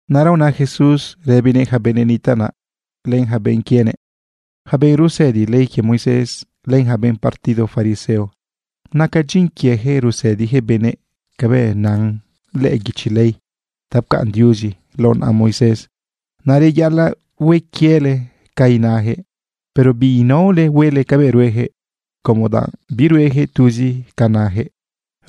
Naꞌra una Jesús rëbinëꞌ ja benëꞌ nitaꞌ naꞌ len ja benꞌ quienëꞌ: ―Ja benꞌ rusëdi ley quie Moisés, len ja benꞌ partido fariseo, nacan dyin quiejëꞌ rusëdijëꞌ benëꞌ cabëꞌ nan lëꞌë guichi ley ta pcaꞌn Diuzi lao naꞌa Moisés. Naꞌ reyaꞌalaꞌ hue quiele ca inajëꞌ, pero binaole huele cabëꞌ ruejëꞌ, como danꞌ biruejëꞌ tuzi ca najëꞌ.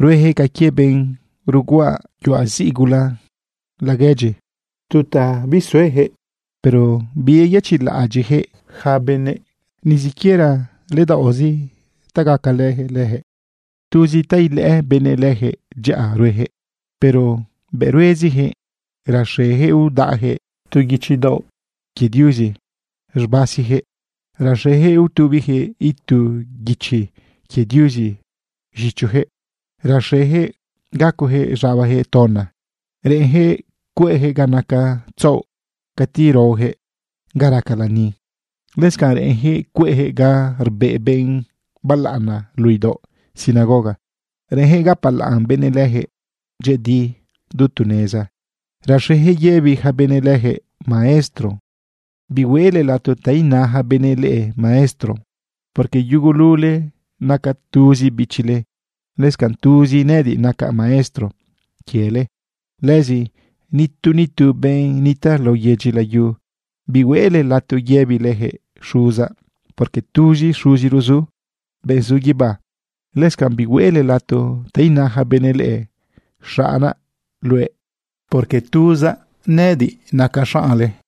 Ruejëꞌ ca quie benꞌ ruguaꞌa yuaꞌ ziꞌ gula laguedyi, tu ta bisueyaquëꞌ. Pero biyeyëchiꞌlaꞌadyiꞌjëꞌ yaca benëꞌ ni siquiera ledaoꞌzi ta gacalëjëꞌ lëjëꞌ. Tuzi ta ilëꞌë benëꞌ lëjëꞌ dyaꞌa ruejëꞌ, pero bëꞌ ruezijëꞌ raxejëꞌ udaꞌjëꞌ tu guichi daoꞌ quie Diuzi z̃basijëꞌ. Raxejëꞌ utubijëꞌ itu guichi quie Diuzi z̃ichojëꞌ. Raxejëꞌ gacojëꞌ z̃abajëꞌ tona. Reꞌenjëꞌ cueꞌjëꞌ ga naca tzaoꞌ cati raojëꞌ ga raca lani. Lëscanꞌ reꞌenjëꞌ cueꞌjëꞌ ga rbeꞌ benꞌ balaꞌana luꞌu idaoꞌ sinagoga. Reꞌenjëꞌ gapalaꞌn benëꞌ lëjëꞌ dyëꞌëdi du tu neza. Raxejëꞌ yëbi ja benëꞌ lëjëꞌ: “Maestro.” ’Bihuele lato ta ina ja benëꞌ leꞌe: “Maestro”, porque yugulule naca tuzi bichile, lëscanꞌ tuzi nëꞌëdiꞌ nacaꞌ maestro quiele. Lëzi nitu nitu benꞌ nitaꞌ lao yedyi layu, bihuele lato yëbilejëꞌ: “Xuzaꞌ”, porque tuzi Xuziro zu, benꞌ zu guibá. Lëscanꞌ bihuele lato ta ina ja benëꞌ leꞌe: “Xaꞌnaꞌ luëꞌ”, porque tuzi nëꞌëdiꞌ nacaꞌ xaꞌnle.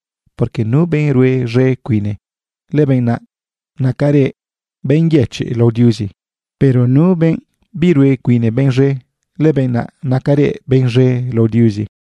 Porque nu benꞌ rue z̃e cuine, lëbenꞌ naꞌ nacarëꞌ benꞌ yëchiꞌ lao Diuzi. Pero nuꞌ benꞌ birue cuine benꞌ z̃e, lëbenꞌ naꞌ nacarëꞌ benꞌ z̃e lao Diuzi.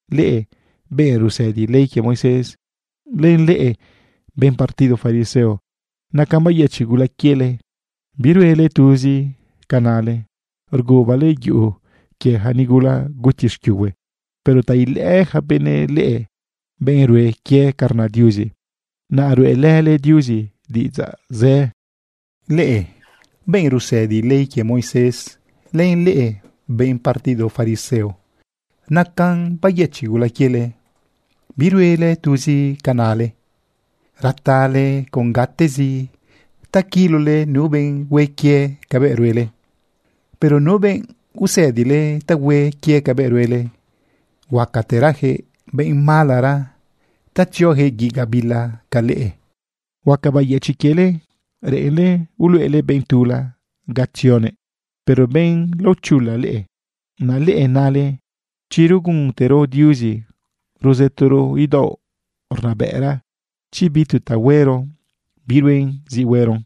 ’¡Leꞌe benꞌ rusëdi ley quie Moisés, len leꞌe benꞌ partido fariseo, nacan bayëchiꞌ gula quiele! Biruele tuzi ca nale. Rgubale yuꞌu quie ja nigula guti xquiuhue, pero ta ilëꞌë ja benëꞌ leꞌe benꞌ rue quie ca rna Diuzi, naꞌ ruꞌelële Diuzi diꞌidzaꞌ zë. ’¡Leꞌe benꞌ rusëdi ley quie Moisés, len leꞌe benꞌ partido fariseo, nacan bayëchiꞌ gula quiele! Biruele tuzi ca nale. Ratale con gatezi ta quilole nu benꞌ hue quie cabëꞌ ruele. Pero nu benꞌ usëdile ta hue quie cabëꞌ ruele, huacaterajëꞌ benꞌ malara ta tziojëꞌ guiꞌ gabila ca leꞌe. ’¡Huaca bayëchiꞌ quiele! Reꞌenle uluꞌele benꞌ tula ga tzionëꞌ, pero benꞌ laochula leꞌe. Naꞌ leꞌe nale: “Chi ruguntero Diuzi ruzëtoro idaoꞌ rnabëꞌra chi bi tu ta huero, biruen zi hueron.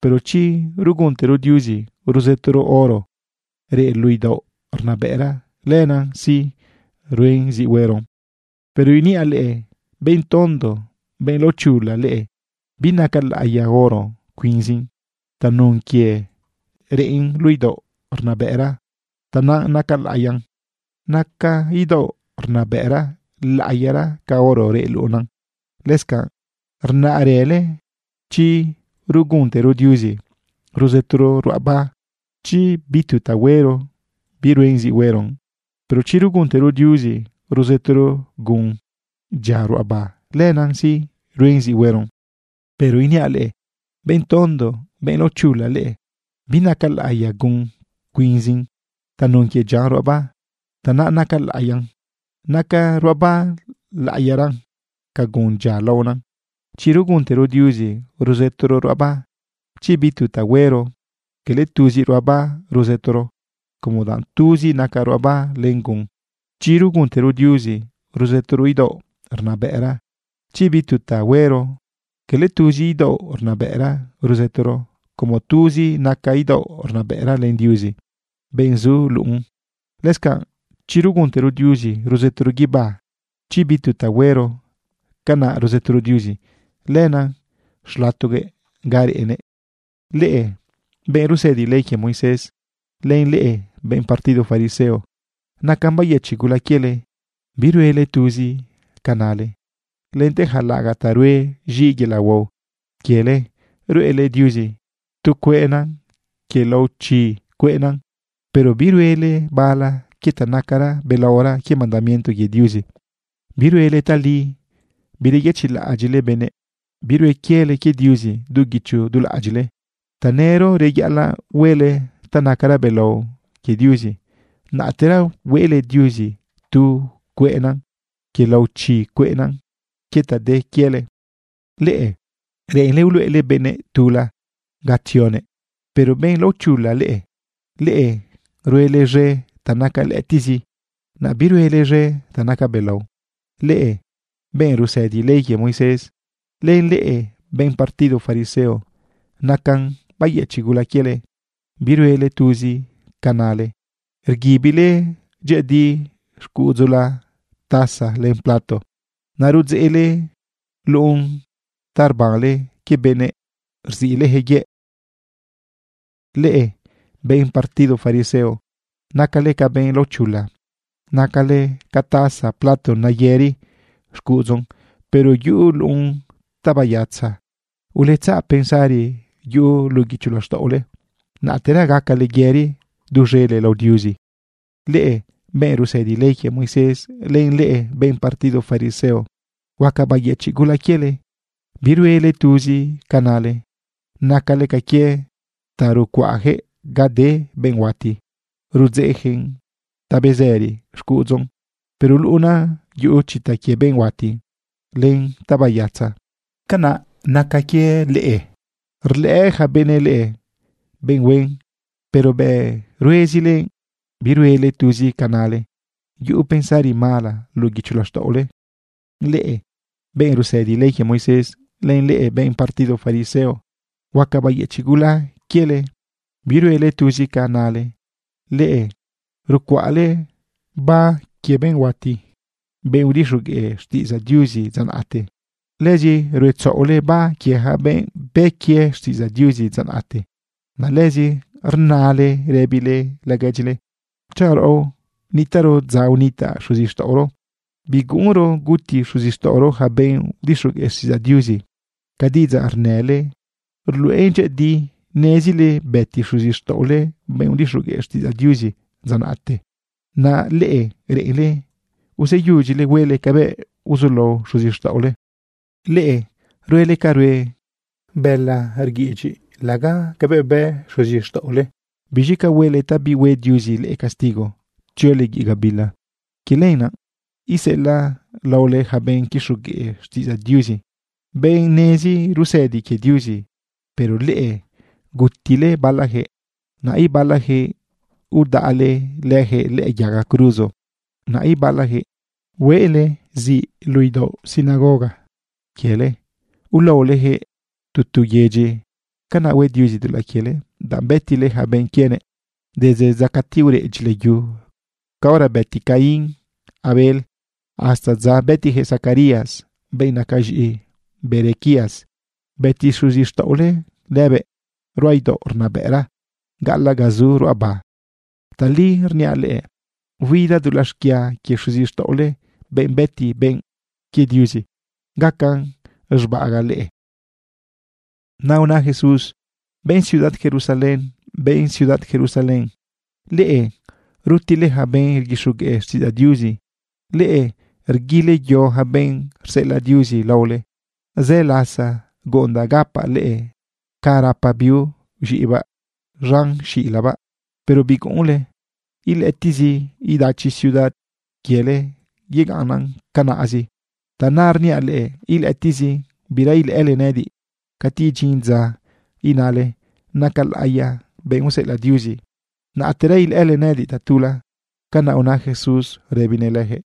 Pero chi ruguntero Diuzi ruzëtoro oro reꞌ luꞌu idaoꞌ rnabëꞌra, lenan sí, ruen zi hueron.” ¡Pero iniaꞌ leꞌe, benꞌ tondo, benꞌ laochula leꞌe! Binaca laꞌiya oro cuinzin. Tanun quie reꞌn luꞌu idaoꞌ rnabëꞌra, tanaꞌ naca laꞌiyan. Naca idaoꞌ rnabëꞌra laꞌiyaran ca oro reꞌ luꞌun. Lëscanꞌ rnarële: “Chi ruguntero Diuzi ruzëtoro ruꞌaba chi bi tu ta huero, biruen zi hueron. Pero chi ruguntero Diuzi ruzëtoro gun dyia ruꞌaba, lenan sí, ruen zi hueron.” Pero iniaꞌ leꞌe, ¡benꞌ tondo, benꞌ laochula leꞌe! Binaca laꞌiya gun cuinzin. Tanun quie dyian ruꞌaba, tanaꞌ naca laꞌiyan. Naca ruꞌaba laꞌiyaran ca gun dyia laonan. Chi ruguntero Diuzi ruzëtoro ruꞌaba chi bi tu ta huero, quele tuzi ruꞌaba ruzëtoro como danꞌ tuzi naca ruꞌaba len gun. Chi ruguntero Diuzi ruzëtoro idaoꞌ rnabëꞌra chi bi tu ta huero, quele tuzi idaoꞌ rnabëꞌra ruzëtoro como tuzi naca idaoꞌ rnabëꞌra len Diuzi, benꞌ zu luꞌun. Lëscanꞌ chi ruguntero Diuzi ruzëtoro guibá chi bi tu ta huero, canaꞌ ruzëtorëro Diuzi lënëꞌ xlatoguëꞌ ga reꞌnëꞌ. ’¡Leꞌe benꞌ rusëdi ley quie Moisés, len leꞌe benꞌ partido fariseo, nacan bayëchiꞌ gula quiele! Biruele tuzi ca nale. Lente ja laꞌagaꞌ ta ruen z̃iꞌ yelaꞌ huao quiele ruꞌele Diuzi tu cueꞌna quie lao chi cueꞌna, pero biruele bala quie ta naca belaora quie mandamiento quie Diuzi. Biruele tali. Bireyëchiꞌlaꞌadyiꞌle benëꞌ. Birue quiele quie Diuzi du guicho du laꞌadyiꞌle. Tanëro reyaꞌalaꞌ huele ta nacara belao quie Diuzi, naꞌtera hueꞌle Diuzi tu cueꞌna quie lao chi cueꞌna quie ta de quiele. ¡Leꞌe reꞌenle uluꞌele benꞌ tula ga tzionëꞌ, pero benꞌ laochula leꞌe! ¡Leꞌe ruele z̃e ta naca lëꞌëtiꞌzi, naꞌ biruele z̃e ta naca belao! ’¡Leꞌe benꞌ rusëdi ley quie Moisés, len leꞌe benꞌ partido fariseo, nacan bayëchiꞌ gula quieleꞌ Biruele tuzi ca nale. Rguibile dyëꞌëdi xcuꞌudzula taza len plato. Naꞌ rudzeꞌle luꞌun ta rbanle quie benëꞌ rziꞌlejëꞌ yëꞌ. Leꞌe benꞌ partido fariseo, nacale ca benꞌ laochula. Nacale ca taza plato neyëri xcuꞌudzun, pero yuꞌu luꞌun ta bayatza. Uletzaꞌ pensari yuꞌu luꞌu guicho laxtaꞌole, naꞌtera gacale yëri duz̃ele lao Diuzi. ’¡Leꞌe benꞌ rusëdi ley quie Moisés, len leꞌe benꞌ partido fariseo, huaca bayëchiꞌ gula quiele! Biruele tuzi ca nale. Nacale ca quie ta rucuaꞌjëꞌ ga de benꞌ huati. Rudzeꞌjëꞌn ta bezëri xcuꞌudzun, pero luꞌunan yuꞌu chita quie benꞌ huati len ta bayatza. Canaꞌ naca quie leꞌe. Rlëꞌë ja benëꞌ leꞌe benꞌ huen, pero bëꞌ ruezile biruele tuzi ca nale, yuꞌu pensari mala luꞌu guicho laxtaꞌole. ’¡Leꞌe benꞌ rusëdi ley quie Moisés, len leꞌe benꞌ partido fariseo, huaca bayëchiꞌ gula quiele! Biruele tuzi ca nale. Leꞌe rucuaꞌle ba quie benꞌ huati, benꞌ udixogueꞌ xtiꞌidzaꞌ Diuzi dza naꞌte. Lëzi ruetzaꞌole ba quie ja benꞌ bë quie xtiꞌidzaꞌ Diuzi dza naꞌte. Naꞌ lëzi rnale rëbile laguedyile: “Chanꞌ raꞌo nitaꞌro dza unitaꞌ xuzixtaꞌoro, biguꞌunro guti xuzixtaꞌoro ja benꞌ udixogueꞌ xtiꞌidzaꞌ Diuzi.” Ca diꞌidzaꞌ rnële ruluꞌen dyëꞌëdi nezile bëti xuzixtaꞌole benꞌ udixogueꞌ xtiꞌidzaꞌ Diuzi dza naꞌte. Naꞌ leꞌe reꞌenle useyudyile huele cabëꞌ uzulao xuzixtaꞌole. ’¡Leꞌe ruele ca rue bëla rguiꞌidyiꞌ laga cabëꞌ bë xuzixtaꞌole! ¿Biz̃i ca huele ta bihue Diuzi leꞌe castigo tziole guiꞌ gabila? Quie lenaꞌ iseꞌelaꞌ laole ja benꞌ quixogueꞌ xtiꞌidzaꞌ Diuzi, benꞌ nezi rusëdi quie Diuzi. Pero leꞌe gutile balajëꞌ, naꞌ ibalajëꞌ udaꞌle lëjëꞌ lëꞌë yaga cruzo. Naꞌ ibalajëꞌ hueꞌle ziꞌ luꞌu idaoꞌ sinagoga quiele ulaolejëꞌ tu tu yedyi. Canaꞌ hue Diuzi dulaꞌ quiele, danꞌ bëtile ja benꞌ quienëꞌ, desde dza cati ureꞌ dyilayu caora bëti Caín Abel, hasta dza bëtijëꞌ Zacarías, benꞌ naca z̃iꞌi Berequías. Bëti xuzixtaꞌole lëbëꞌ ruꞌa idaoꞌ rnabëꞌra gaꞌalaꞌ ga zu ruꞌaba. Tali rniaꞌ leꞌe, huida dulaꞌ xquia quie xuzixtaꞌole, benꞌ bëti benꞌ quie Diuzi, gacan z̃baꞌagaꞌ leꞌe. Naꞌ una Jesús: ―Benꞌ ciudad Jerusalén, benꞌ ciudad Jerusalén, leꞌe rutile ja benꞌ rguixogueꞌ xtiꞌidzaꞌ Diuzi. Leꞌe rguile yo ja benꞌ rseꞌelaꞌ Diuzi laole. Zë lasa guꞌundaꞌ gapaꞌ leꞌe ca rapa biu z̃iꞌibaꞌ z̃an xilabaꞌ, pero biguꞌunle. Ilëꞌëtiꞌzi idachi ciudad quiele yegaꞌnnan canaꞌzi. Tanaꞌrniaꞌ leꞌe, ilëꞌëtiꞌzi bira ilëꞌële nëꞌëdiꞌ. Cati idyin dza inale: “Naca laꞌiya benꞌ useꞌelaꞌ Diuzi”, naꞌtera ilëꞌële nëꞌëdiꞌ tatula. ―Canaꞌ una Jesús rëbinëꞌ lëjëꞌ.